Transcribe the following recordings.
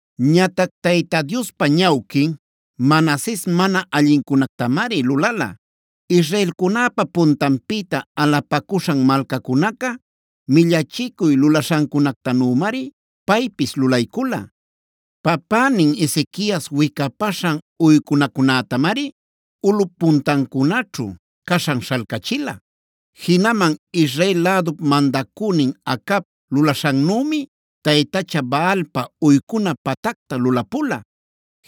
Ñatac Tayta Diospa ñawquin Manases mana allincunactamari lulala.a Israelcunäpa puntanpïta alapacuśhan malcacunaca millachicuy lulaśhancunactanümari paypis lulaycula. Papänin Ezequias wicapaśhan uycunacunätamari ulꞌup puntancunaćhu caśhan śhalcachila. Jinaman Israel lädup mandacünin Acab lulaśhannümi, taytacha Baalpa uycuna pactacta lulapula.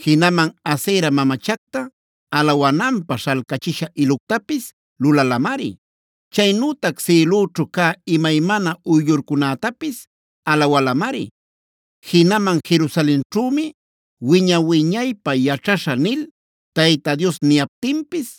Jinaman Asera mamachacta alawananpä śhalcachisha iluctapis lulalamari. Chaynütac sïlüćhu cä imaymana uyllurcunätapis alawalamari. Jinaman Jerusalenćhümi wiña-wiñaypä yaćhaśhä nil Tayta Dios niyaptinpis,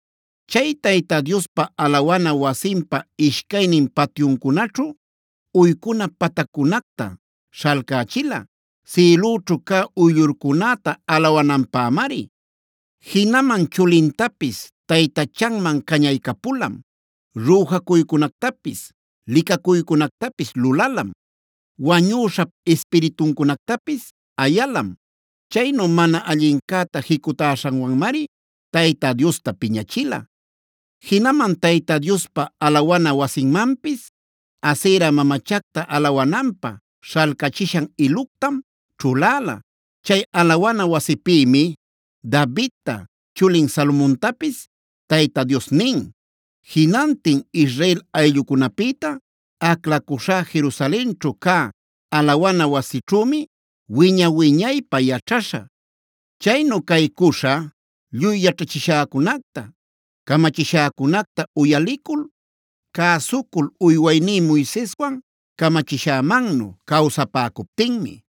Chay Tayta Diospa alawana wasinpa ishcaynin patyuncunaćhu, uycuna pataccunacta śhalcächila, sïlüćhu cä uyllurcunäta alawananpämari. Jinaman chulintapis taytachanman cañaycapulam, rüjacuycunactapis licacuycunactapis lulalam, wañüśhap ispirituncunactapis ayalam. Chaynu mana allincäta jicutaśhanwanmari Tayta Diosta piñachila. Jinaman Tayta Diospa alawana wasinmanpis, Asera mamachacta alawananpä śhalcachishan iluctam ćhuläla. Chay alawana wasipïmi Davidta, chulin Salomontapis Tayta Dios nin: “Jinantin Israel ayllucunapïta aclacuśhá Jerusalenćhu cä alawana wasićhümi wiña-wiñaypä yaćhaśhä. Chaynu caycuśha lluy yaćhachishäcunacta camachishäcunacta uyalicul, cäsucul uywayní Moiseswan camachishämannu cawsapäcuptinmi.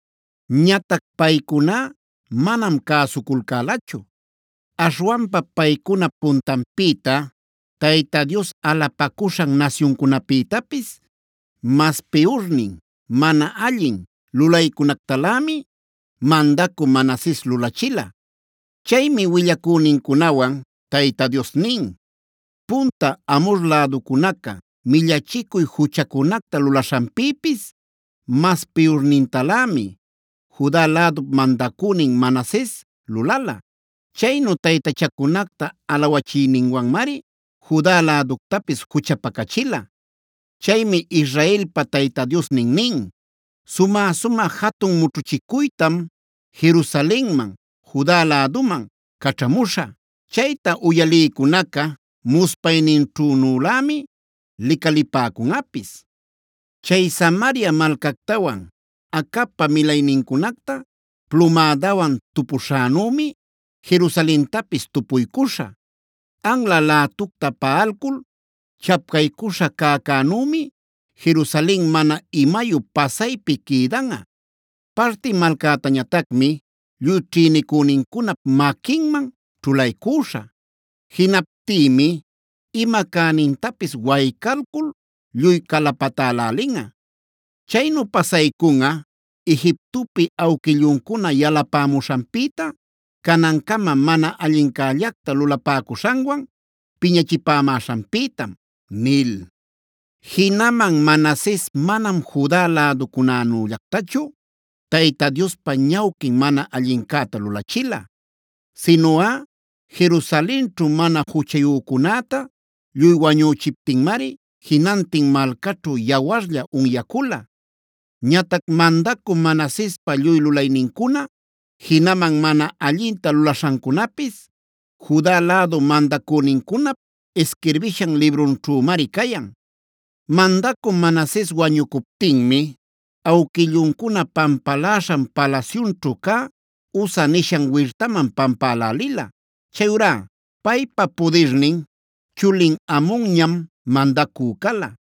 Ñatac paycuná manam cäsuculcälachu. Aśhwanpa paycunap puntanpïta Tayta Dios alapacuśhan nasyuncunapïtapis, mas piyurnin mana allin lulaycunactalämi, mandacü Manases lulachila. Chaymi willacünincunawan Tayta Dios nin: “Punta Amhor läducunaca millachicuy juchacunacta lulaśhanpïpis mas piyurnintalämi, Juda lädup mandacünin Manases lulala. Chaynu taytachacunacta alawachiyninwanmari Juda läductapis juchapacachila. Chaymi Israelpa Tayta Diosnin nin: ‘Sumä-sumä jatun mućhuchicuytam Jerusalenman, Juda läduman caćhamuśhä. Chayta uyalïcunaca muspayninćhünülämi licalipäcunꞌapis. Chay Samaria malcactawan Acabpa milaynincunacta plumädawan tupushänümi, Jerusalentapis tupuycuśha. Anla lätucta paꞌalcul chacpaycuśha cäcänümi Jerusalen mana imayu pasaypi quïdanꞌa. Parti malcätañatacmi lluy ćhïnicünincunap maquinman ćhulaycüśhä. Jinaptïmi ima cänintapis waycalcul lluy calapatälälinꞌa. Chaynu pasaycunꞌa Egiptopi awquilluncuna yalapämuśhanpïta, canancama mana allincällacta lulapäcuśhanwan piñachipämäśhanpïtam’” nil. Jinaman Manases manam Juda läducunällactachu Tayta Diospa ñawquin mana allincäta lulachila. Sinuꞌa Jerusalenćhu mana juchayücunäta lluy wañüchiptinmari jinantin malcaćhu yawarlla unyacula. Ñatac mandacü Manasespa lluy lulaynincuna, jinaman mana allinta lulaśhancunapis Juda lädu mandacünincunap isquirbishan librunćhümari cayan. Mandacü Manases wañucuptinmi awquilluncuna pampaläśhan palasyunćhu cä, Uza nishan wirtaman pampälälila. Chayurá paypa pudirnin chulin Amonñam mandacü cala.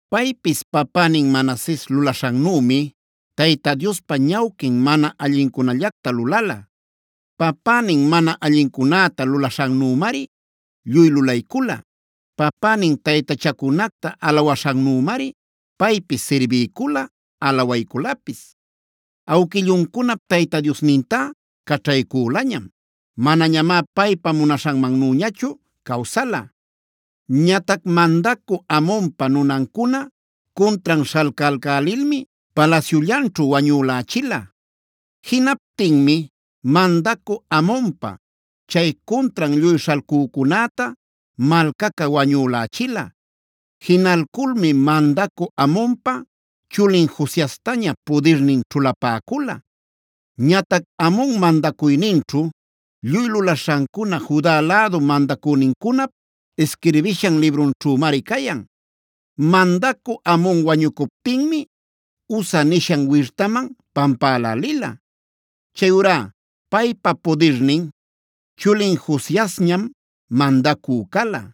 Paypis papänin Manases lulaśhannümi, Tayta Diospa ñawquin mana allincunallacta lulala. Papänin mana allincunäta lulaśhannümari lluy lulaycula. Papänin taytachacunacta alawaśhannümari paypis sirbiycula, alawayculapis. Awquilluncunap Tayta Diosnintá caćhaycülañam. Manañamá paypa munaśhanmannüñachu cawsala. Ñatac mandacü Amonpa nunancuna cuntran śhalcalcälilmi palasyullanćhu wañülächila. Jinaptinmi mandacü Amonpa, chay cuntran lluy śhalcücunäta malcaca wañülächila. Jinalculmi mandacü Amonpa chulin Josiastaña pudirnin ćhulapäcula. Ñatac Amon mandacuyninćhu lluy lulaśhancuna Juda lädu mandacünincunap isquirbishan librunćhümari cayan. Mandacü Amon wañucuptinmi Uza nishan wirtaman pampälälila. Chayurá paypa pudirnin chulin Josiasñam mandacü cala.